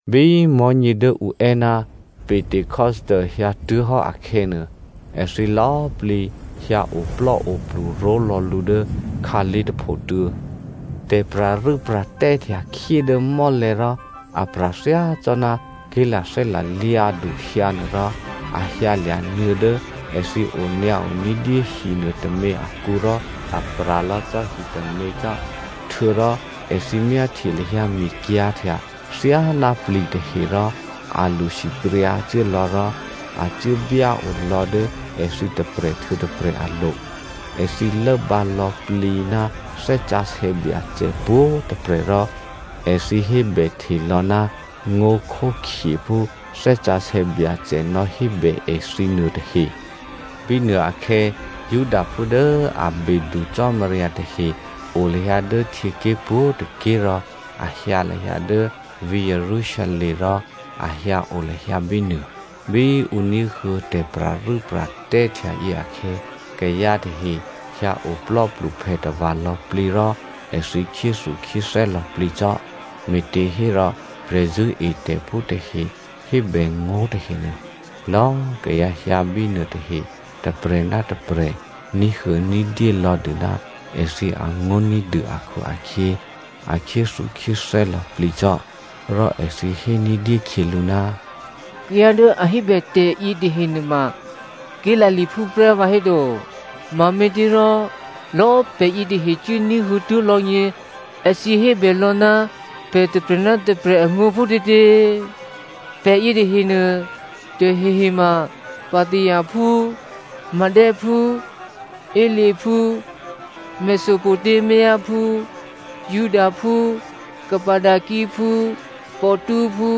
Bí mò̤́nyě dố ǔ è́ ná Pentecosto hyǎtuố̤hò́ akhè̌nuô, èthǐ lò̌꤮ plǐ hyǎ oplò́oplu ró̤lò̌ lǔ dố khǎlé̤ tôphotuô̌. Tè̤pra̤rû́pra̤tè́ htya khyé dố mò́lè̤̌ rò a pra̤ thyácò́ná ké̤lathè́ lalyǎdu hyǎnuôrò a hyǎlya̤ nuô̌ dố èthǐ onyǎo ní̤dyé hinuô tômě akǔ rò a pra̤ lò̌ cò́ hitômě cò́. Htuô̌rò èthǐ myáhtye lahyǎ mikyǎ̤htya thyáná pli̤tahe rò a lṳsipryǎcuố lò̌ rò a cuố byáo lò̌ dố èthǐ tôprè̤ htuô̌ tôprè̤ alo̤. Èthǐ lốbǎ lò̌plǐ ná Thè́ Sǎsè̌ Byacè pwǒ̤꤮ tôprè̤ rò èthǐ hébèhte lò̌ ná ngó̤khókhye phú Thè́ Sǎsè̌ Byacè nò̌hébè èthǐ nuôtahe. Bínuôakhè̌ Judaphú dố a bedu Cò́marya tahe o lahyǎ dố htyěké̤ pwǒ̤tôké̤ rò a hyǎ lahyǎ dố vǐ̤ Jerusalem rò a hyǎ o lahyǎ bínuô. Bí ǔ ní̤huô̌ tè̤pra̤rû́pra̤tè́ htyayě akhè̌, kayǎ tahe hyǎ oplò́pluphè tava̤ lò̌plǐ rò èthǐ khyéthukhyéthè́ lò̌plǐ cò́, me̤těhérò prè̤zṳ̂́etè̤phú tahe hébè ngó̤ tahenuô, lò̌꤮ kayǎ hyǎ bínuô tahe, tôprè̤ ná tôprè̤ ní̤huô̌ ní̤dyé lò̌ dû ná èthǐ angó̤ ní̤dû akhu-akhyě, a khyéthukhyéthè́ lò̌plǐ cò́. Rò èthǐ hé ní̤dyé khyělǔ, “Kayǎ dố a hébè tè̤ yětahe nuôma Galileaphú prè́ vǎhéto? Mame̤těrò lò̌꤮ pè̤ yětahe cuốní̤huô̌ tuố̤ lò̌gně èthǐ hébè lò̌ ná pè̤ tôprè̤ ná tôprè̤ angó̤ phútětě? Pè̤ yětahenuô, tahehe ma Pathiaphú, Medephú, Elamitephú, Mesopotamiaphú, Judaphú, Cappadociaphú, Pontusphú,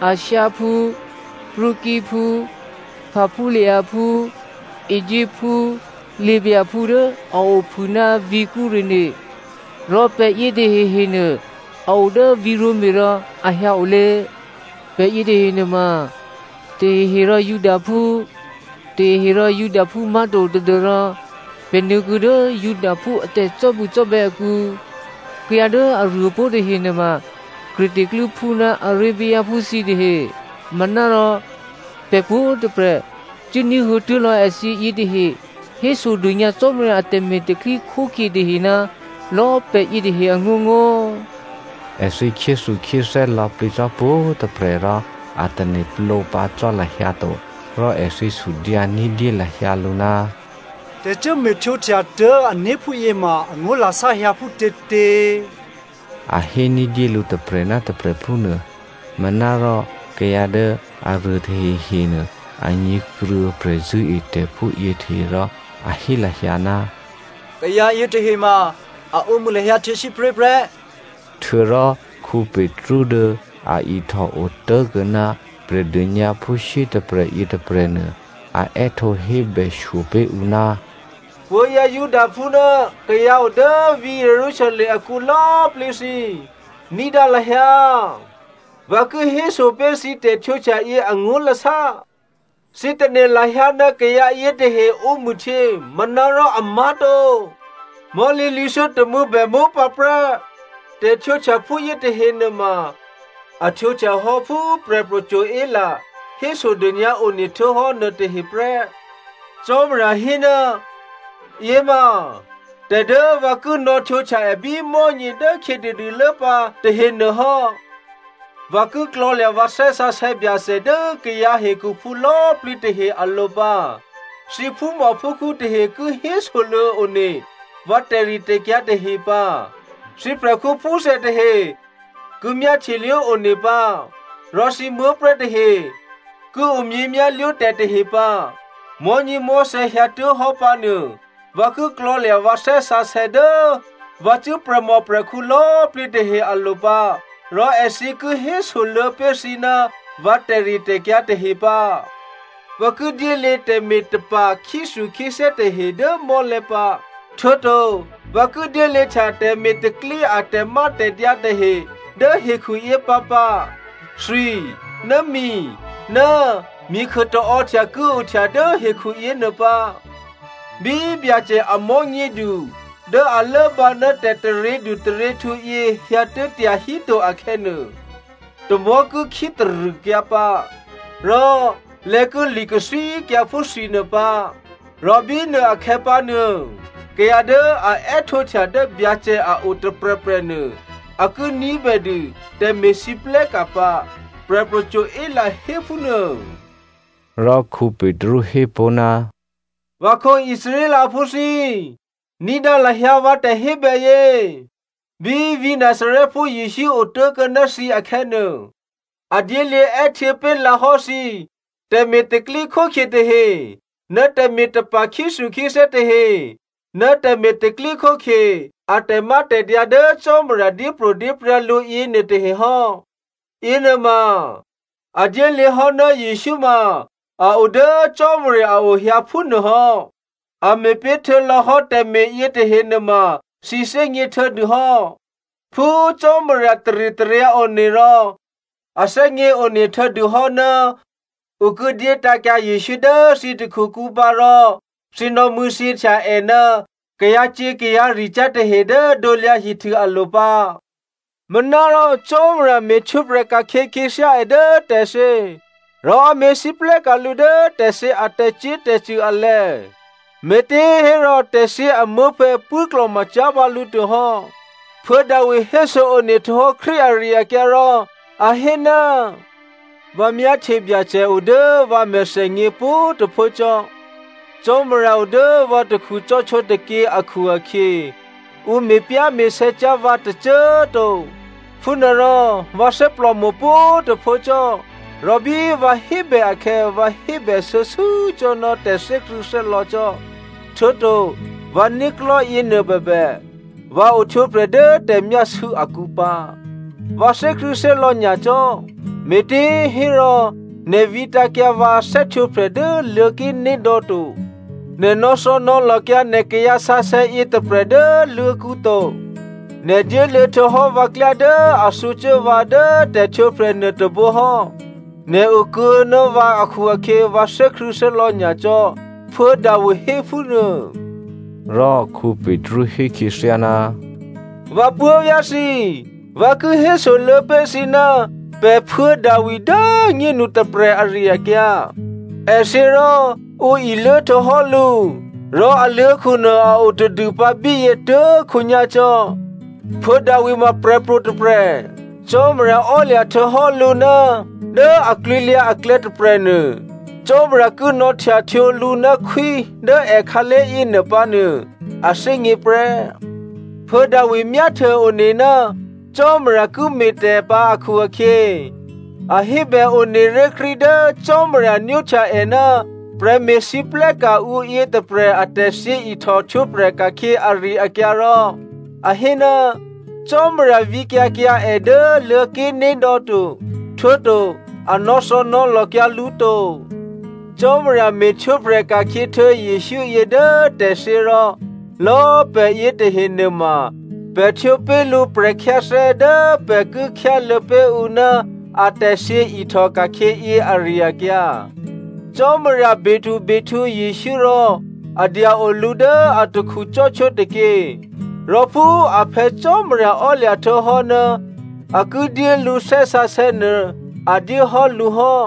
Asiaphú, Phrygiaphú, Pamphyliaphú, Egyptphú, Libyaphú dố a ophû ná vǐ̤ Cyreneo, rò pè̤ yětahehenuô a o dố vǐ̤ Roma rò a hyǎ olě. (Pè̤ yětahe nuôma tahehe rò Judaphú, tahehe rò Judaphú má̤to tadû́rò pè̤ nuô̌kuô̌ dố Judaphú a tè̤cò́bucò́bè̌ akǔ.) Kayǎ dố aruô pó̤ tahe nuôma Creta klû́phú ná Arabiaphú thǐtahe. Manárò pè̤ pwǒ̤꤮ tôprè̤ cuốní̤huô̌ tuố̤ lò̌ èthǐ yětahe hésodônyǎ Cò́marya atè̤me̤ tè̤pro̤tè̤prya̤ tahe ná lò̌꤮ pè̤ yětahe angó̤ngó̤.” Èthǐ khyéthukhyéthè́ lò̌plǐ cò́ pwǒ̤꤮ tôprè̤ rò a tane̤plǒ pǎ cò́ lahyǎ to, rò èthǐ sudyǎ ní̤dyé lahyǎ lǔ, “Tè̤ cuốme̤ htwǒhtya tuố̤ ané̤ phúyě ma angó̤lasá hyǎ phútětě?” A hé ní̤dyé lǔ tôprè̤ ná tôprè̤ phúnuô. Manárò kayǎ dố aruô tahehenuô a nyě̤kruô̌ prè̤zṳ̂́etè̤phú yětahe rò a hé lahyǎ, “Kayǎ yětahe ma a ǒmṳ̂ lahyǎ htyěsípré̤ prè́.” Htuô̌rò Petru dố a ihtòo tố̤kuô̌ ná Prè̤dônyǎphú shyétôprè̤ yětôprè̤nuô a è́htǒ hébè shyo pé̤ ǔ, “Puố̤vyá̤ Judaphú ná kayǎ o dố vǐ̤ Jerusalem akǔ lò̌꤮ plǐ thǐ꤮ ní̤dǎ lahyǎ! Vǎ ki héso pé̤ thǐ tè̤htwǒhtya yě angó̤lasá. Thǐ tane̤ lahyǎ ná kayǎ yětahe ǒmṳ̂htyě manárò amá̤to, mò̤́lǐ lwǐ̤thyótômû̌ bè mópǎprè́! Tè̤htwǒhtya phúyě tahe nuôma a htwǒhtyahò́ phú Prè̤pro̤ Joel hésodônyǎ one htuô̌hò́ nuôtahe prè́. ‘Cò́marya hé, yěma tè̤ dố vǎ ki nò̌htwǒhtya è bí mò̤́nyě dố khyětadûlố pǎ tahenuô hò́, vǎ ki klò̤̌lya̤ vǎ Thè́ Sǎsè̌ Byacè dố kayǎ hekhuphú lò̌꤮ plǐ tahe alo̤ pǎ꤮, thǐ phúmòphúkhǔ tahe ki hésoluô̌ one vǎ tè̤ritè̤kyǎ tahe pǎ, thǐ prè̤khǔphúthè tahe ki myáhtyelwó one pǎ, rò thǐ muố̤prè̤́ tahe ki omyěmyá̤lwó tè̤ tahe pǎ. Mò̤́nyěmò̤́thè̌ hyǎtuố̤hò́ pǎ nuô, vǎ ki klò̤̌lya̤ vǎ Thè́ Sǎsè̌ dố vǎcṳ̂́ prè̤mòprè̤khǔ lò̌꤮ plǐ tahe alo̤ pǎ rò èthǐ ki hésoluô̌ pé̤ thǐ ná vǎ tè̤ritè̤kyǎ tahe pǎ. Vǎ ki dyéluô̌ tè̤me̤tapa̤ khyéthukhyéthè́ tahe dố mò́lè̤̌ pǎ, htuô̌to vǎ ki dyéluô̌htya tè̤me̤ tè̤pro̤tè̤prya̤ a tè̤mátè̤dyǎ tahe dố hekhu yě pǎpǎ, thwi, ná mi, ná mikhuô taò́htya ki ohtya dố hekhuyěnuô pǎ. Bí Byacè a mò̤́nyědu dố a lốbǎ ná tè̤taryědu taryěhtǔ yě hyǎtuố̤ tyahíto akhè̌nuô, tamò̤́ ki khítarṳ̂kyǎ pǎ, rò lè̌ ki li̤kathwíkyǎ phú thwinuô pǎ. Rò bínuôakhè̌ pǎnuô kayǎ dố a è́htǒhtya dố Byacè a o tôprè̤prè̤nuô a ki ní̤bèdû tè̤me̤lwóhteka̤ pǎ,’ Prè̤pro̤ Joel hé phúnuô.” Rò Petru hé pó̤, “Vǎkhǒ Israelphú thǐ꤮, ní̤dǎ lahyǎ vǎ tè̤hébèyě! Bí vǐ̤ Nazarèphú Jesǔ otố̤kuô̌ ná thǐ akhè̌nuô, a dyéluô̌ è́htuô̌ pé̤lǎhò́ thǐ tè̤me̤ tè̤pro̤tè̤prya̤ tahe ná tè̤me̤tapa̤ khyéthukhyéthè́ tahe ná tè̤me̤ tè̤pro̤tè̤prya̤ a tè̤mátè̤dyǎ dố Cò́marya dyépro̤dyéprya̤ lǔ yěnuôtahe hò́. Yěnuôma a dyéluô̌hò́ ná Jesǔ ma a o dố Cò́marya a ohyǎ phúnuô hò́. A me̤ pé̤ htuô̌lò̌hò́ tè̤me̤ yětahe nuôma thǐ thè́gně htuô̌dûhò́. Phú Cò́marya taritaryǎ one rò a thè́gněone htuô̌dûhò́ ná ǔ ki dyé tǎ̤kyǎ Jesǔ dố thǐ takhukǔ pǎ rò thǐ nò̌mṳ̂̌thyěhtya è ná kayǎcyě̤ kayǎricyá̤ tahe dố krusu alo̤ pǎ. Manárò Cò́marya me̤htwǒprè̤ ka̤khyě khyěthyá è dố tè̤thyě, rò a me̤lwóhteka̤ lǔ dố tè̤thyě a tè̤cyě̤tè̤cṳ̂ alè̤̌, me̤těhérò tè̤thyě amuố̤phè̌ pṳ̂́klò̤macyá̤ pǎ lǔ to hò́. Phuô̌ Davi héso-one htuô̌hò́ Krístu ari-akyǎ rò a hé, ‘Vǎ myáhtye Byacè o dố vǎ mèthènyě pwǒ̤꤮ tôphuố cò́. Cò́marya o dố vǎ takhu cò́htwó tôkyě akhu-akhyě ǔ me̤pyá̤me̤sè̌ cyá̤ vǎ tôcô꤮ to. Phúnuôrò vǎ thè́plòmo̤ pwǒ̤꤮ tôphuố cò́, rò bí vǎ hébè akhè̌ vǎ hébè shuô̌shuô̌ cò́ ná tè̤thè́krṳ̂̌thè́lò̌ cò́. Htuô̌to vǎ né̤klò̤́ yěnuôbèbè, vǎ ohtwǒprè̤ dố tè̤myásû̌ akǔ pǎ. Vǎ thè́krṳ̂̌thè́lò̌ nyacò́, me̤těhérò nè̤ vǐtǎ̤kyǎ vǎ thè́htwǒprè̤ dố Luô̤̌ké̤nédò̌ to. Nè̤ nò̌thò̌nò̌lòkyǎ nè̤ kayǎsǎsè̌ yětôprè̤ dố luô̤̌kǔ to. Nè̤ dyéluô̌ htuô̌hò́ vǎ klyá dố a thǔcuố vǎ dố tè̤htwǒprè̤ nuôtôbǒ hò́, nè̤ okuô̌ ná vǎ akhu-akhyě vǎ thè́krṳ̂̌thè́lò̌ nyacò́,’ Phuô̌ Davi hé phúnuô.” Rò Petru hé khyěthyá, “Vǎ puố̤vyá̤ thǐ꤮, vǎ ki hésoluô̌ pé̤ thǐ ná pè̤ Phuô̌ Davi dố꤮ nyénu tôprè̤ ari-akyǎ. È thyě rò ǔ iluố htuô̌hò́ lǔ, rò aluô̤̌khunuô a o tadû pǎ bíyě tuố̤khǒnyá̤ cò́. Phuô̌ Davi ma prè̤pro̤ tôprè̤. Cò́marya ò́lya̤ htuô̌hò́ lǔ ná dố aklwǐlyǎ aklè̌ tôprè̤nuô, Cò́marya ki nò̌htyahtwǒ lǔ ná khwí dố èkhǎlé̤ yěnuô pǎnuô, a thè́gně prè́. Phuô̌ Davi myáhtye-one ná Cò́marya ki me̤tè̤ pǎ akhu-akhyě a hébè one ré̤ Krístu dố Cò́marya nwóhtya è ná prè̤me̤lwóhteka̤ ǔ yětôprè̤ a tè̤thyěihtò htwǒprè̤ ka̤khyě ari-akyǎ rò a hé, Cò́marya vǐkyǎ kyǎ è dố Luô̤̌ké̤nédò̌ to. Htuô̌to a nò̌thò̌nò̌lòkyǎ lǔ to. Cò́marya me̤htwǒprè̤ ka̤khyě htuô̌ Jesǔ yě dố tè̤thyě rò lò̌꤮ pè̤ yětahe nuôma pè̤ htwǒ pé̤ lǔ prè̤khyáthè́ dố pè̤ ki khyáluô̌ pé̤ ǔ ná atè̤thyě ihtòka̤khyě yě ari-akyǎ. Cò́marya bedubehtǔ Jesǔ rò a dya-o lǔ dố atakhu cò́htwó tôkyě, rò phú a Phè̌ Cò́marya ò́lya̤ htuô̌hò́ ná a ki dyé lǔ Thè́ Sǎsè̌ nuô a dyéhò́ lǔ hò́.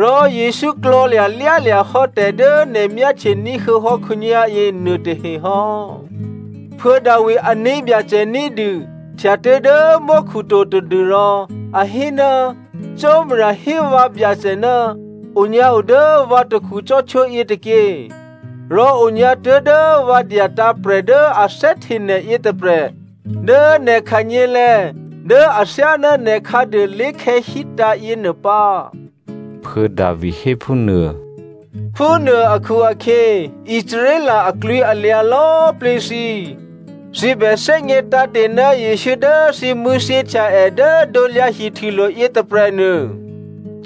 Rò Jesǔ klò̤̌lya̤lyálya̤ hò́ tè̤ dố nè̤ myáhtye ní̤huô̌hò́ khǒnyá̤yě nuôtahe hò́. Phuô̌ Davi ané̤byacè ní̤dû htya tuố̤dố mò́khu to tadû́rò a hé, ‘Cò́marya hé vǎ Byacè, “Onyǎo dố vǎ takhu cò́htwó yětôkyě. Rò onyǎ tuố̤dố vǎ dyatǎ̤ prè̤ dố a thè́hte nè̤ yětôprè̤ dố nè̤ khanyělè̤̌ dố athyáná nè̤ khǎduô lé̤khè̌zí̤tǎ̤ yěnuô pǎ,”’ Phuô̌ Davi hé phúnuô. “Phúnuô akhu-akhyě Israel aklwǐalyǎ lò̌꤮ plǐ thǐ꤮ thǐ bè thè́gně tǎ̤te̤ ná Jesǔ dố thǐ mṳ̂̌thyěhtya è dố krusulo̤ yětôprè̤nuô,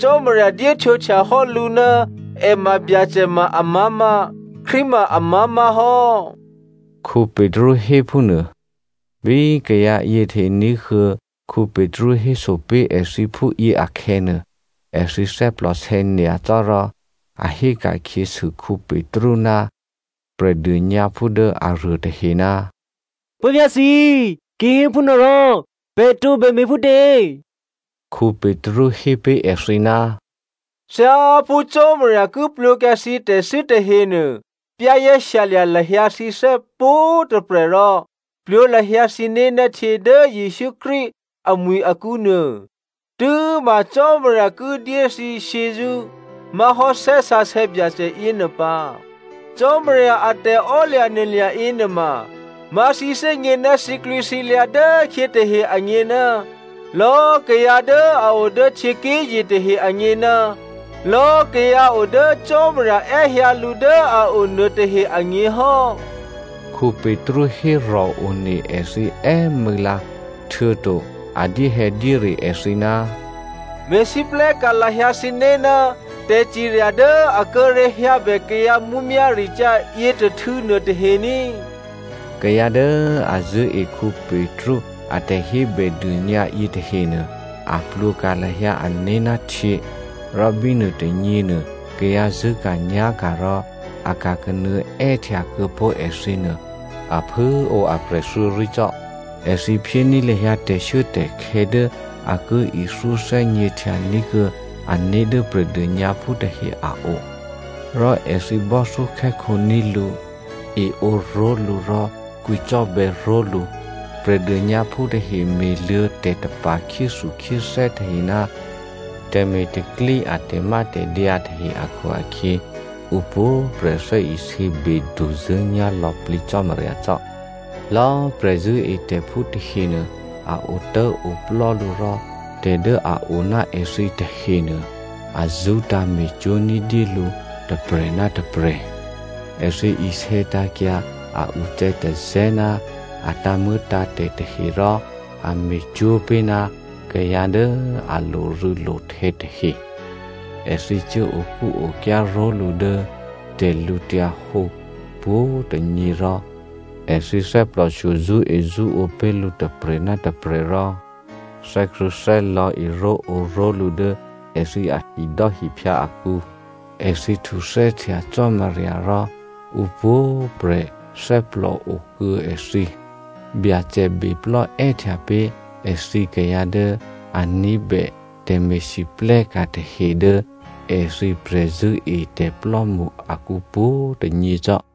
Cò́marya dyéhtwǒhtya hò́ lǔ ná è ma Byacè ma amá̤má̤, Krístu ma amá̤má̤ hò́,” Petru hé phúnuô. Bí kayǎ yětahe ní̤huô̌ Petru héso pé̤ èthǐ phúyě akhè̌nuô, èthǐ thè́plòsè̌ nyacò́ rò a héka̤khyěsû Petru ná Prè̤dônyǎphú dố aruôtahe, “Puố̤vyá̤ thǐ꤮, kihéphúnuôrò pè̤ tǒbè me̤phútě?” Petru hé pé̤ èthǐ, “Thyáphú Cò́marya ki plwǒkyǎ thǐ tè̤thû́ tahenuô za̤ ní̤dû lahyǎ thǐné̤ pwǒ̤꤮ tôprè̤ rò plwǒ lahyǎ thǐné̤ ná htyě dố Jesǔ Krístu amwi̤ akǔnuô, tû́ma Cò́marya ki dyé thǐ shyězṳ́ má̤hò́ Thè́ Sǎsè̌ Byacè yěnuô pǎ. Cò́marya a tè̤emaklò̤ yěnuôma, má̤ thǐgně ná thǐklwǐthǐlyǎ dốkhyě tahe agně, lò̌꤮ kayǎ dố a o dố htyěké̤ye̤ tahe agně ná lò̌꤮ kayǎ o dố Cò́marya è́hyǎ lǔ dố a o nuôtahe agně hò́.” Petru hérò̤ one èthǐ è́mû̌lǎ, htuô̌to a dyéhè̌dyére èthǐ, “Me̤lwóhteka̤ lahyǎ thǐné̤ ná tè̤cirya dố a kíré̤ hyǎbè kayǎ mǔmyá̤ricyá̤ yětôhtû̌ nuôtahe ní!” Kayǎ dố a zṳ̂́e Petru a tè̤hébèdônyǎ yětahenuô a plwǒka̤ lahyǎ ané̤ ná htyě, rò bínuôtônyěnuô, kayǎ zṳ̂́ka̤nyá̤ka̤ rò a ka̤kanuô̌ è́htya kuô̌ pó̤ èthǐ nuô, a phû꤮ o aprè̤ thuô̌rí cò́. Èthǐ phyéní̤ lahyǎ tè̤shuốtè̤khè̌ dố a ki ithyó thè́gněhtyaní̤ kuô̌ ané̤ dố Prè̤dônyǎphú tahe a o, rò èthǐ bò́thyókhè́khǒní̤ lǔ, eǒ ró̤lǔ rò kwǐcò́bè̌ ró̤lǔ. Prè̤dônyǎphú tahe me̤luô̌ tè̤tapa̤ khyéthukhyéthè́ tahe ná tè̤me̤ tè̤pro̤tè̤prya̤ a tè̤mátè̤dyǎ tahe akhu-akhyě ǔpwǒ̤꤮ prè̤ thè́isě beduzṳ̂́nyá̤ lò̌plǐ Cò́marya cò́. Lò̌꤮ prè̤zṳ̂́etè̤phú tahenuô a otố̤oplò́ lǔ rò tè̤ dố a o ná èthǐ tahenuô, a zṳ́tǎ̤ me̤cwó̤ ní̤dyé lǔ tôprè̤ ná tôprè̤. Èthǐ isè̌tǎ̤kyǎ a ucè̌tazè̌ ná a tǎ̤muô̌tǎ̤tè̤ tahe rò a me̤cwó̤ pé̤ ná kayǎ dố a lorû̌lohtè̌ tahe. Èthǐ cuố okúokyá ró̤lǔ dố tè̤lǔhǒdu pwǒ̤꤮ tônyě rò èthǐ thè́plòshyo zṳ́ezṳ́ǒ pé̤ lǔ tôprè̤ ná tôprè̤ rò thè́krṳ̂̌thè́lò̌ eró̤ǒró̤lǔ dố èthǐ ahidò́hiphyǎ akǔ. Èthǐ htuthè́htya Cò́marya rò ǔpwǒ̤꤮ prè̤ thè́plò okuô̌ èthǐ. Byacè beplò́ è́htya pé̤ èthǐ kayǎ dố a ní̤bè tè̤me̤lwóhteka̤ tahe dố èthǐ prè̤zṳ̂́etè̤plò́mṳ akǔ pwǒ̤꤮ tônyě cò́.